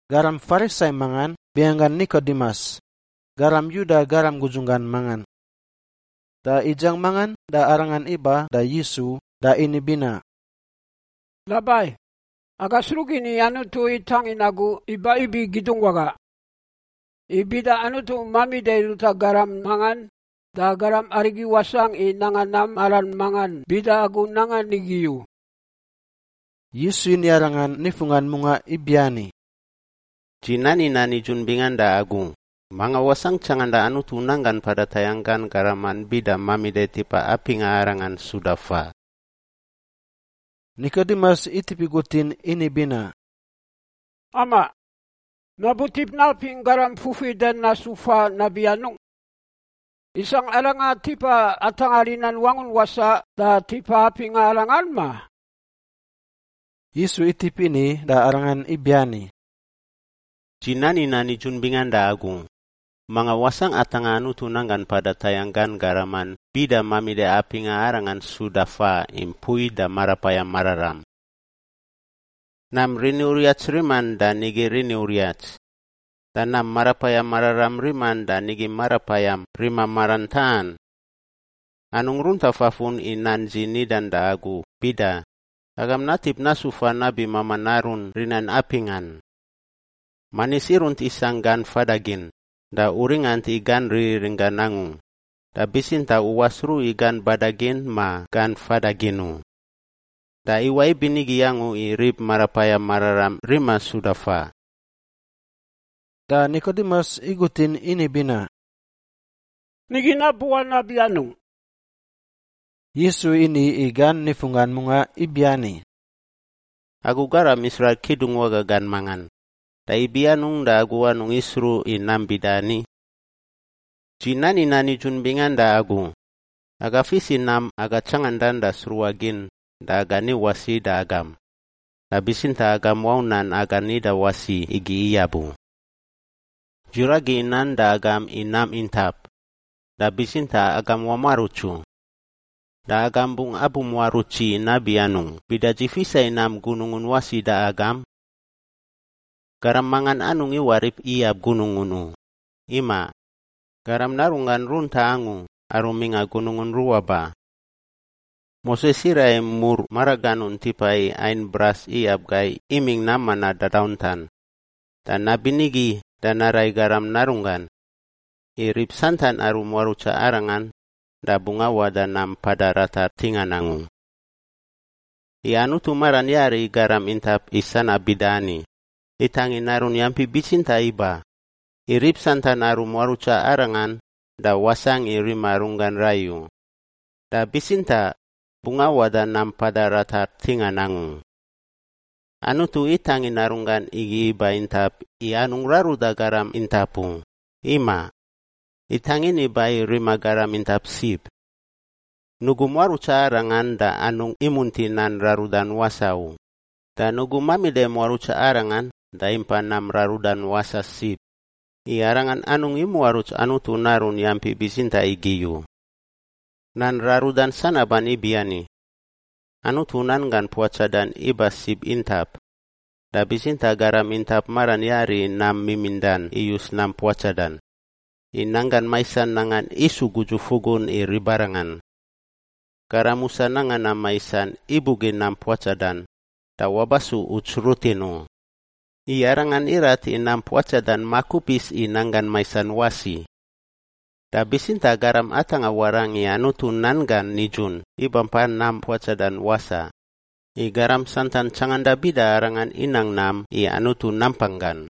Garam Farisai mangan binganggan Nikodimus, garam Yuda garam gudzunggan mangan. Da idziang mangan da arangan iba da Yisu da ini binaꞌ, “Rabai, aga sruꞌ gin i Anutu itangin agu iba ibi kidungwaga. I bida Anutu mamida i ruta garam mangan, da garam arigi wasangꞌ i nanga nam maran mangan bida agu nangan igi u.” Yisu ini arangan nifunggan mungaꞌ ibiani, “Dzi nani nan nidzun bingan da agu, manga wasangꞌ tsanganda Anutu nanggan mpada tayangꞌ gan garaman bida mamida i tipa apingꞌa arangan suda faꞌ.” Nikodimus itip igutin ini binaꞌ, “Amaꞌ! Nabutip napingꞌ garam fufidan nasu faꞌ nabi anungꞌ? Isangꞌ aranga tipa atangꞌa rinan wangun wasaꞌ da tipa apingꞌa arangan, ma?” Yisu itip ini da arangan ibiani, “Dzi nani nan nidzun bingan da agu, manga wasangꞌ atangꞌa Anutu nanggan mpada tayangꞌ gan garaman bida mamida apingꞌa arangan suda faꞌ i mpui da Marapayam Mararam. Nam rini uriats riman da nigi rini uriats. Da nam Marapayam Mararam riman da nigi marapayam rima maran taꞌan. Anungꞌ runta fafun i nan dzi nidan da agu bida, ‘Agam natip nasu faꞌ nabi mamaꞌ narun rinan apingꞌan.’ Manis irunt isangꞌ gan fadagin da u ringant i gan ririringgan angu, da bitsintaꞌ u wasruꞌ i gan badagin ma gan fadagin u. Da iwaꞌ ibinigi angu i rib Marapayam Mararam rima suda faꞌ.” Da Nikodimus igutin ini binaꞌ, “Nigi nabuwaꞌ nabi anungꞌ?” Yisu ini i gan nifunggan mungaꞌ ibiani, “Agu garam Israil kidungwaga gan mangan, da ibi anungꞌ da agu anungꞌ isruꞌ i nam bida ani? Dzi nani nan nidzun bingan da agu, aga fis i nam aga tsangandan da sruꞌa gin da aga ni wasi da agam, da bitsintaꞌ agam wau nan aga nida wasi igi iyab u. Dzi ragi nan da agam i nam intap, da bitsintaꞌ agam wamuaruts u. Da agam bungꞌ abumuaruts dzi nabi anungꞌ bida dzi fisa i nam gunungun wasi da agam? Garam mangan anungꞌ iwarip iyab gunungun u; imaꞌ, Garam Narunggan runtaꞌ angu aru mingꞌa gunungun ruꞌa ba. Moses iraꞌ i mur maraganun tipa i ain bras iyab gai imingꞌ nam manaꞌ dadauntan, da nabinigi da naraꞌ i Garam Narunggan, i rib santan aru muarutsa Arangan da bungꞌ awaꞌ da nam mpada ratar ntingan angu. “I Anutu maran yari i garam intap i sanab bida ani: itangin Narun yampi bitsintaꞌ iba, i rib santan aru muarutsa Arangan da wasangꞌ i rima runggan rai u, da bitsintaꞌ bungꞌ awaꞌ da nam mpada ratar ntingan angu. Anutu itangin Narunggan igi iba intap i anungꞌ raruda garam intap u, imaꞌ. Itangin iba i rima garam intap sib. Nugu muarutsa Arangan da anungꞌ imunti nan rarudan wasaꞌ u, da nugu mamida i muarutsa Arangan da impa nam rarudan wasaꞌ sib, i arangan anungꞌ imuaruts Anutu Narun yampi bitsintaꞌ igi u. Nan rarudan sanaban ibiani, Anutu nanggan puatsadan iba sib intap, da bitsintaꞌ garam intap maran yari i nam mimindan iyus nam puatsadan, i nanggan maisan nangan isu gudzu-fugun i ribarangan. Garam musa nanga nam maisan ibugin nam puatsadan da wabasu uts rutin u, i arangan irat i nam puatsadan makupis i nanggan maisan wasi. Da bitsintaꞌ garam atangꞌa warangꞌ i Anutu nan gan nidzun iba mpa nam puatsadan wasaꞌ, i garam santan tsanganda bida arangan inang nam i Anutu nampang gan.”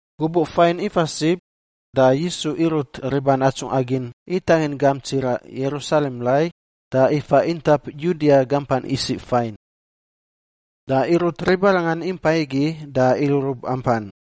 Gubuꞌ fain ifa sib da Yisu irut riban atsungꞌa gin itangin gamp tsiraꞌ Yerusalem rai da ifa intap Yudia gampan isiꞌ fain. Da irut ribarangan impai igi da irurub ampan.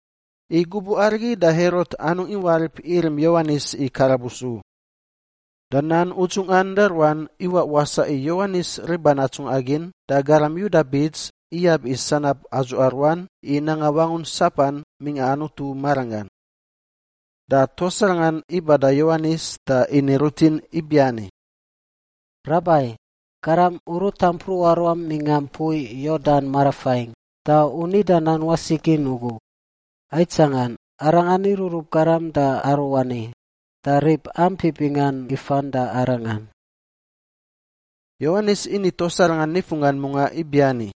I gubuꞌ arigi da Herot anungꞌ iwarip irim Yowanis i karabus u. Da nan udzungꞌan da ruan iwaꞌ wasaꞌ i Yowanis riban atsungꞌa gin da garam Yuda bits iyab i sanab adzuꞌa ruan i nanga wangun sapan mingꞌa Anutu maranggan. Da tuas arangan iba da Yowanis da ini rutin ibiani, “Rabai, garam u ruta mpruꞌa ruam mingꞌa mpui Yordan marafain, da u nida nan wasi gin ugu, aitsangan, arangan irurub garam da aruani, da rib ampi bingan ifan da arangan.” Yowanis ini tuas arangan nifunggan mungaꞌ ibiani,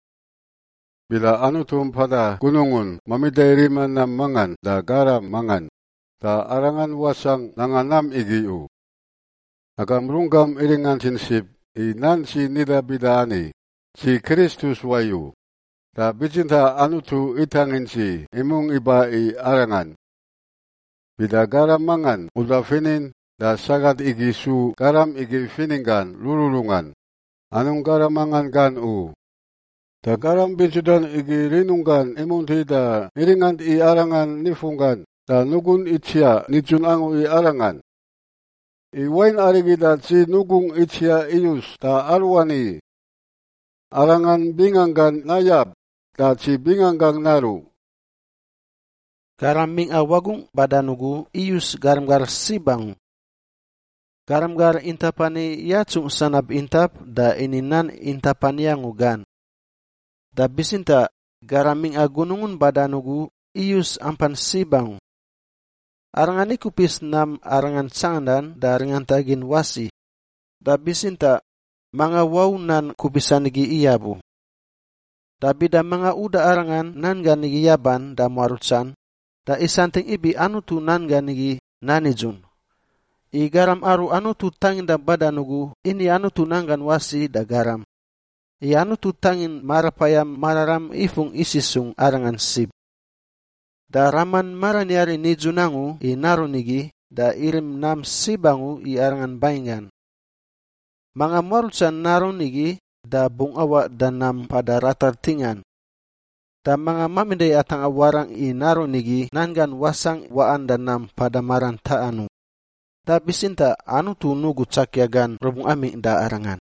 “Bida Anutu mpada gunungun mamida i rima nam mangan da garam mangan, da arangan wasangꞌ nanga nam igi u. Agam runggam iringantin sib i nan dzi nida bida ani, ‘Dzi Kristus wayu, da bitsintaꞌ Anutu itangin dzi imungꞌ iba i Arangan.’ Bida garam mangan uda finin, da sagat igi su garam igi fininggan rururungan; anungꞌ garam mangan gan u. Da garam bintsudan igi rinunggan imunti da iringant i arangan nifunggan da nugun itsiaꞌ nidzun angu i arangan. I wain arigi da dzi nugungꞌ itsiaꞌ iyus da aruani. Arangan binganggan nayab da dzi binganggangꞌ naruꞌ.” Garam mingꞌa wagungꞌ badan ugu iyus garam gar sib angu. Garam gar intap ani yatsungꞌ sanab intap da ini nan intap ani angu gan. Da bitsintaꞌ garam mingꞌa gunungun badan ugu iyus ampan sib angu. Arangan ikupis nam Arangan tsangandan da ringanta gin wasi, da bitsintaꞌ manga wau nan kupisan igi iyab u. Da bida manga uda Arangan nan gan igi yaban da muarutsan, da isantingꞌ ibi Anutu nan gan igi nan nidzun. I garam aru Anutu tanginda badan ugu ini Anutu nan gan wasi da garam, i Anutu itangin Marapayam Mararam ifungꞌ isisungꞌ Arangan sib. Da Raman maran yari nidzun angu i Narun igi da irim nam sib angu i Arangan banginggan. Manga muarutsa Narun igi da bungꞌ awaꞌ da nam mpada ratar ntingan. Da manga mamida i atangꞌa warangꞌ i Narun igi nan gan wasangꞌ waꞌan da nam mpada maran taꞌan u, da bitsintaꞌ Anutu nugu tsakia gan rubungꞌ amingꞌ da arangan.